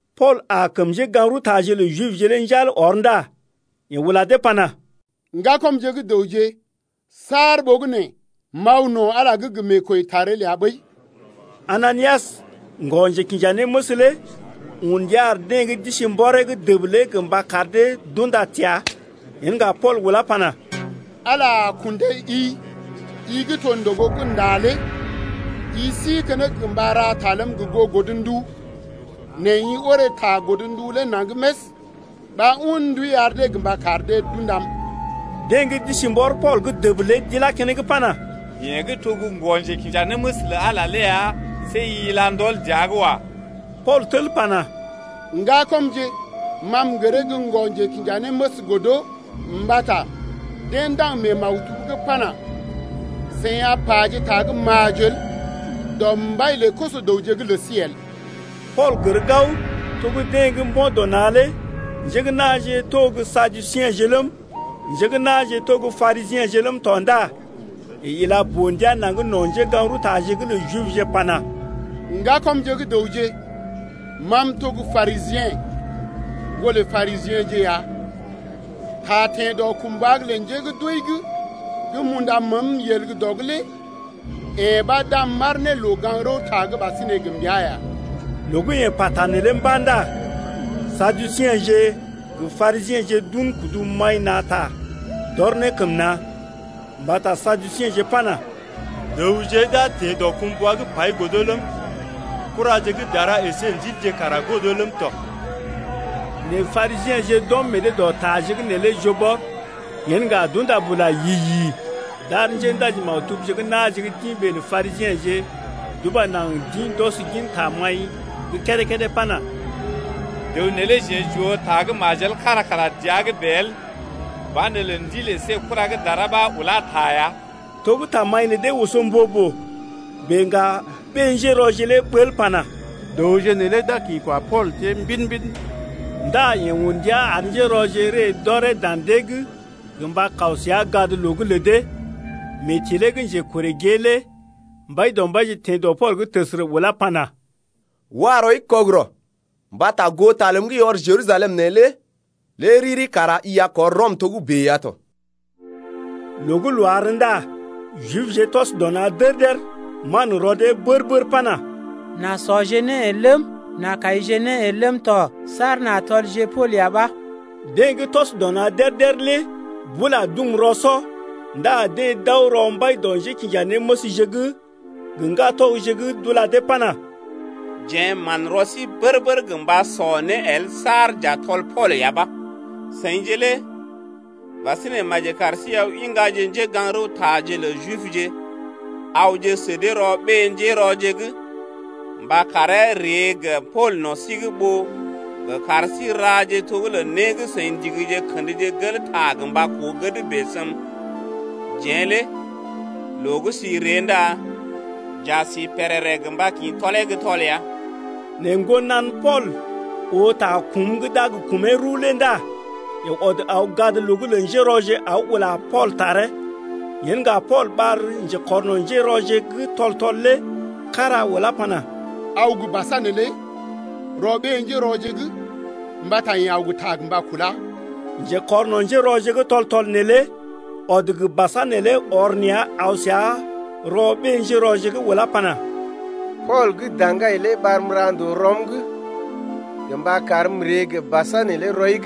Pool aa kəm njégaŋ-rəwtaje lə Jibje lé njal ɔr ndá yeḛ ula dee pana: Ŋgakɔmje gə́ dəwje, saar ɓogənè m’aw no̰ Ala’g gə meekwəitar el ya ɓəi. Ananias, ŋgɔ-njekinjanéməs lé un ndia ar deḛ gə́ d’isi mbɔree’g dəb lé gə mba kar dee d’unda təa. Yen ŋga Pool ulá pana: Ala a kundai-i, i gə́ to ndògo gə́ ndá lé. I si keneŋ gə mba ra ta ləm gə goo godndu, nɛ i orè ta godndu lé naŋg més ɓa un ndui ar dee gə mba kar dee d’undam. Deḛ gə́ d’isi mbɔr Pool’g dəb lé d’ilá keneŋ pana: Yeḛ gə́ to gə́ ŋgɔ-njekinjanéməs lə Ala ya, see i ila ndɔl dəa’g wa. Pool tel pana: Ŋgakɔmje, ma m’gəree gə́ ŋgɔ-njekinjanéməs el mbata deḛ ndaŋg mee maktub’g pana: Seḭ a paje ta gə́ majel dɔ mbai lə koso-dəwje’g lə sí el. Pool gər gao to gə́ deḛ gə́ mbo̰ dɔ na̰ lé njé gə́ na̰je to gə́ Saduseḛje ləm, njé gə́ na̰je to gə́ Parisiḛje ləm tɔ ndá yeḛ ila boo-ndia naŋg no̰ njégaŋ-rəwtaje’g lə Jibje pana: Ŋgakɔmje gə́ dəwje, ma m’to gə́ Parisiḛ, ŋgolə Parisiḛje ya. Ta teḛ dɔkumbwa’g lə njé gə́ d’wəi’g gə́ m’unda məəm yel gə́ dɔ’g lé yee ɓa d’am m’aar ne loo-gaŋg-rəwta’g ɓasinè gə mbəa ya. Loo gə́ yeḛ pata neelé mba̰ ndá Saduseḛje gə Parisiḛje d’un kudu maḭ na̰ ta d’ɔr ne kəm na̰. Mbata Saduseḛje pana: Dəwje d’a teḛ dɔkumbwa’g pai godo ləm, kuraje gə́ dara əsé ndilje kara godo ləm tɔ. Nɛ Parisiḛje d’ɔm meḛ dee dɔ taje’g neelé joo bɔr. Yen ŋga d’unda bula yi-yi d’ar njéndaji-maktubje gə́ na̰je gə́ d’ḭ ɓee lə Parisiḛje d’uba naŋg d’ḭ d’ɔs gin tamaḭ gə́ kédé-kédé pana: Dəw neelé jeḛ j’oo ta gə́ majel kára kara dəa’g bèe el. Banelə ndil əsé kura gə́ dara ɓa ulá ta ya. To gə́ tamaḭ lə dee oso mbo-boo bèe ŋga ɓé-njérɔje lé ɓəl pana: Dəwje neelé d’a kḭ kwa Pool tiee mbidi-mbidi ndá yeḛ un ndia ar njérɔje ree d’ɔree dan dee’g gə mba kaw səa gadloo’g lə dee. Mee tilee gə́ njekorè gée lé Mbaidɔmbaije teḛ dɔ Pool’g təsərə ulá pana: Wa rɔi kɔgərɔ! Mbata goo ta ləm gə́ i ɔr Jerusalem neelé lé riri kara i a kɔr Rɔm togə́bè ya tɔ. Loo gə́ loo àr ndá Jibje tɔs dɔ na̰ dér-dér manrɔ dee bər-bər pana: N’a sɔje né el ləm, n’a kaije né el ləm tɔ saar n’a tɔlje Pool ya ɓa. Deḛ gə́ tɔs dɔ na̰ dér-dér lé bula dum rɔ-sɔ. Ndá deḛ d’aw rɔ mbai dɔ njékinjanéməsje’g gə ŋgatɔgje’g d’ula dee pana: Jeḛ manrɔ sí bər-bər gə mba sɔ né el saar j’a tɔl Pool ya ɓa. Seḭje lé ɓasinè maji kar sí aw iŋgaje njégaŋ-rəwtaje lə Jibje awje sə dee rɔ ɓé-njérɔje’g gə mba karee ree gə Pool no̰ sí’g ɓó gə́ kar sí raje to gə́ lə né gə́ seḭ ndigije kəndje gel ta gə mba koo gəd bèe səm. Jeḛ lé loo gə́ sí ree ndá j’a sí pèrèrè gə mba kḭ tɔlee gə́ tɔl ya. Nɛ ŋgonan Pool oo ta kum gə́ d’a gə kumee rəw lé ndá yeḛ ɔd aw gadloo’g lə njérɔje aw ula Pool taree. Yen ŋga Pool ɓar njekɔrno̰ njérɔje gə́ tɔl-tɔl lé kára ulá pana: Aw gə basa neelé rɔ ɓé-njérɔje’g mbata yeḛ aw gə ta gə mba kulá. Njékɔrno̰ njérɔje gə́ tɔl-tɔl neelé ɔd gə basa neelé ɔr nea̰ aw səa rɔ ɓé-njérɔje’g ulá pana: Pool gə́ daŋgai lé ɓarm ra ndòo rɔm’g gə mba karm m’ree gə basa neelé rɔi’g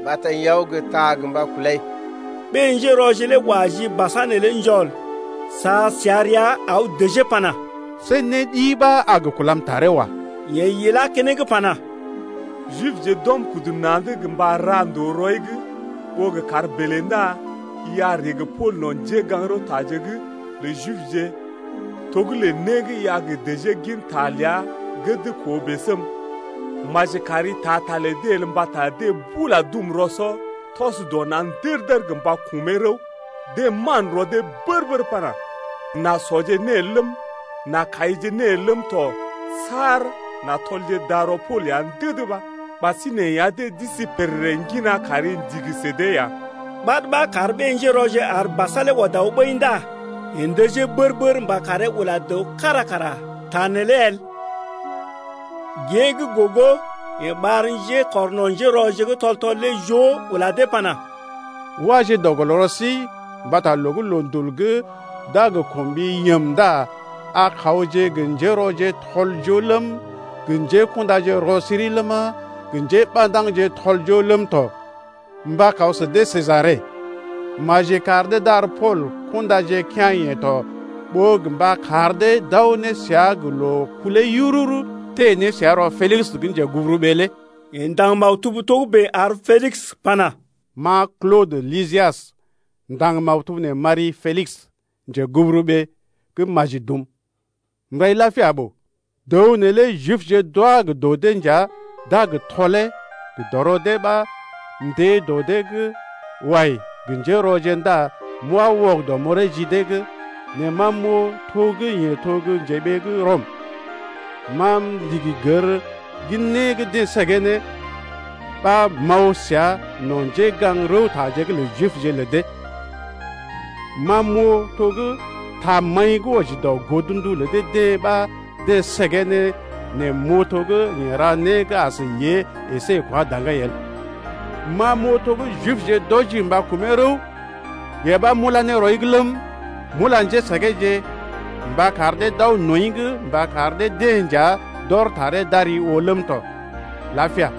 mbata yeḛ aw gə ta gə mba kulai. Ɓé-njérɔje lé wa ji basa neelé njɔl sa səa rəa aw dəjee pana: See né ɗi ɓa a gə kulam taree wa. Yeḛ ilá keneŋ pana: Jibje d’ɔm kudu na̰’d gə mba ra ndòo rɔi’g ɓó gə kar bèlè ndá i a ree gə Pool no̰ njégaŋ-rəwtaje’g lə Jibje to gə́ lə né gə́ i a gə dəjee gin ta ləa gəd koo bèe səm. Maji kari taa ta lə dee el mbata deḛ bula dum rɔ-sɔ tɔs dɔ na̰ der-der gə mba kumee rəw, deḛ manrɔ dee bər-bər pana: N’a sɔje né el ləm, n’a kaije né el ləm tɔ saar n’a tɔlje darɔ Pool ya ndəd ɓa. Ɓasinè ya deḛ d’isi pèrèrè ŋgina kari ndigi sə dee ya. Ɓad ɓa kar ɓé-njérɔje ar basa lé ɔd aw ɓəi ndá yeḛ ndəjee bər-bər mba karee ula dəw kára kara ta neelé el. Gée gə́ gogo yeḛ ɓar njékɔrno̰ njérɔje gə́ tɔl-tɔl joo lé ula dee pana: Waje dɔ gɔl rɔ sí mbata loo gə́ loondul gə́ d’a gə kɔm ɓi yəm ndá a kawje gə njérɔje tɔl-joo ləm, gə njékundaje rɔ-siri ləma, gə njéɓandaŋje tɔl-joo ləm tɔ, mba kaw sə dee Sejare. Maji kar dee d’ar Pool kundaje kea̰-yeḛ tɔ ɓó gə mba kar dee d’aw ne səa gə loo-kulee yururu teḛ ne səa rɔ Pelis gə́ njeguburuɓee’g lé. Yeḛ ndaŋg maktub togə́bè ar Pelis pana: Ma Klodə Lisias m’ndaŋg maktub nee m’ari-i Pelis, njeguburuɓee gə́ maji dum, m’rai lapia ɓoo. Dəw neelé Jibje d’wá gə dɔ dee nja d’a gə tɔlee gə dɔrɔ dee ɓa m’teḛ dɔ dee’g wai gə njérɔje ndá m’wá wɔgədɔ m’ɔree ji dee’g, nɛ ma m’oo to gə́ yeḛ to gə́ njeɓee gə́ Rɔm. Ma m’ndigi gər gin né gə́ deḛ səgee ne ɓa m’aw səa no̰ njégaŋ-rəwtaje’g lə Jibje lə dee. Ma m’oo to gə́ tamaḭ gə́ wɔji dɔ godndu lə dee-deḛ ɓa deḛ səgee ne nɛ m’oo to gə́ yeḛ ra gə́ as yée əsé kwa daŋgai el. Ma m’oo to gə́ Jibje d’wɔji mba kumee rəw, yee ɓa m’ulá ne rɔi’g ləm, m’ula njésəgeeje gə mba kar dee d’aw nɔḭ’g mba kar dee-deḛ nja d’ɔr taree d’ari oo ləm tɔ. Lapia.